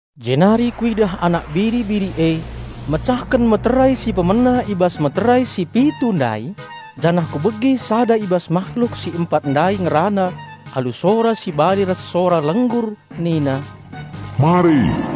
Jenari kuidah Anak Biri-biri e mecahken meterai si pemena i bas meterai si pitu ndai, janah kubegi sada i bas mahluk si empat ndai ngerana alu sora si bali ras sora lenggur nina, "Mari!"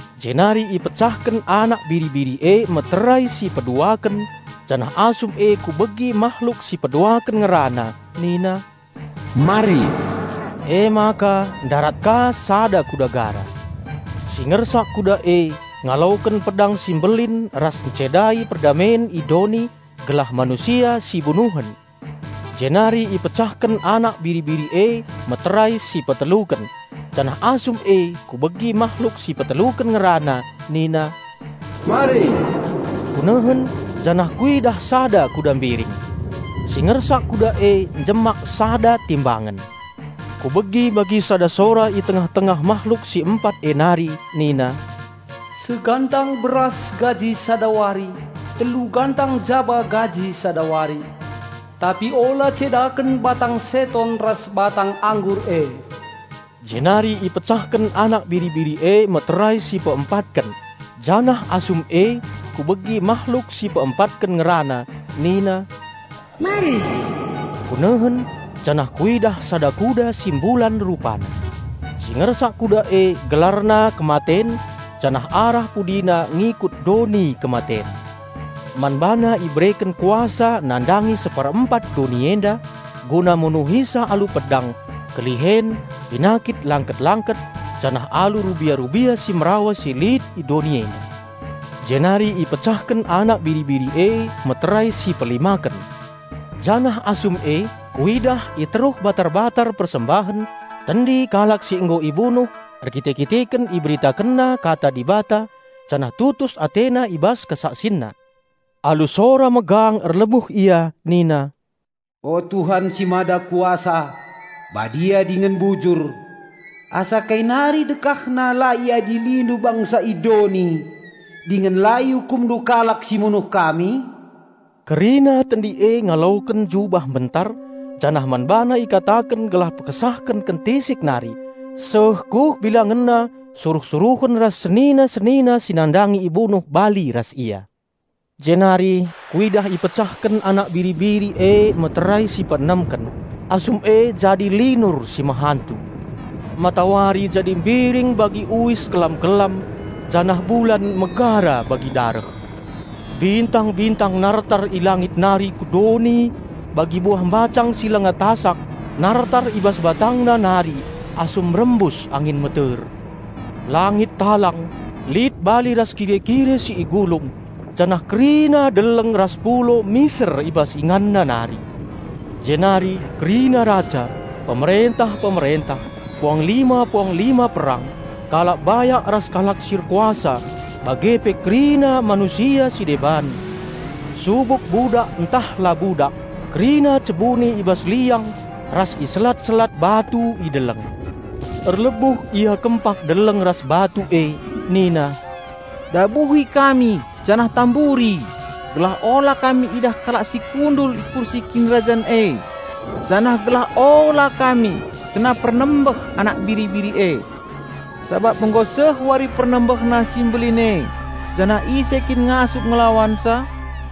Jenari ipecahken Anak Biri-biri e meterai si peduaken, janah asum e kubegi mahluk si peduaken ngerana nina, "Mari!" Emaka ndarat ka sada kuda gara. Si ngersak kuda e ngaloken pedang si mbelin ras ncedai perdamen i doni, gelah manusia si bunuhen. Jenari ipecahken Anak Biri-biri e meterai si peteluken, janah asum e kubegi mahluk si peteluken ngerana nina, "Mari!" Kunehen, janah kuidah sada kuda mbiring. Si ngersak kuda e njemak sada timbangen. Kubegi bagi sada sora i tengah-tengah mahluk si empat e nari nina, "Segantang beras gaji sada wari, telu gantang jaba gaji sada wari. Tapi ula cedaken batang seton ras batang anggur e." Jenari ipecahken Anak Biri-biri e meterai si peempatken, janah asum e kubegi mahluk si peempatken ngerana nina, "Mari!" Kunehen, janah kuidah sada kuda si mbulan rupana. Si ngersak kuda e gelarna Kematen, janah arah pudina ngikut Doni Kematen. Man bana ibereken kuasa nandangi seperempat doni enda, guna munuhisa alu pedang, kelihen, penakit langkit-langkit janah alu rubia-rubia si merawa si lit i doni enda. Jenari ipecahken Anak Biri-biri e meterai si pelimaken. Janah asum e kuidah i teruh batar-batar persembahen tendi kalak si nggo ibunuh erkite-kiteken iberitakenna Kata Dibata janah tutus atena i bas kesaksinna. Alu sora megang erlebuh ia nina, "O Tuhan si Mada Kuasa, Badia dingen Bujur! Asakai nari dekahna la IadiliNdu bangsa i doni dingen la IukumNdu kalak si munuh kami?" Kerina tendi e ngaloken jubah mbentar, janah man bana ikataken gelah pekesahken kentisik nari, seh kuh bilangenna suruh-suruhen ras senina-senina si nandangi ibunuh bali ras ia. Jenari kuidah ipecahken Anak Biri-biri e meterai si peenemken. Asum e jadi linur si mehantu. Matawari jadi mbiring bagi uis kelam-kelam janah bulan megara bagi dareh. Bintang-bintang nartar i langit nari ku doni bagi buah mbacang si langa tasak nartar i bas batangna nari asum rembus angin meter. Langit talang, lit bali ras kire-kire si igulung, janah kerina deleng ras pulo miser i bas ingana nari. Jenari kerina raja, pemerentah-pemerentah, puanglima-puanglima perang, kalak bayak ras kalak si erkuasa bage pe kerina manusia si deban, subuk budak ntah la budak, kerina cebuni i bas gua ras i selat-selat batu i deleng. Erlebuh ia kempak deleng ras batu e nina, "Dabuhi kami janah tamburi gelah ula kami idah kalak si kundul i kursi Kinirajan e, janah gelah ula kami kena pernembeh Anak Biri-biri e! Sabap nggo seh wari PernembehNa si mbelin e, janah ise kin ngasup ngelawansa?"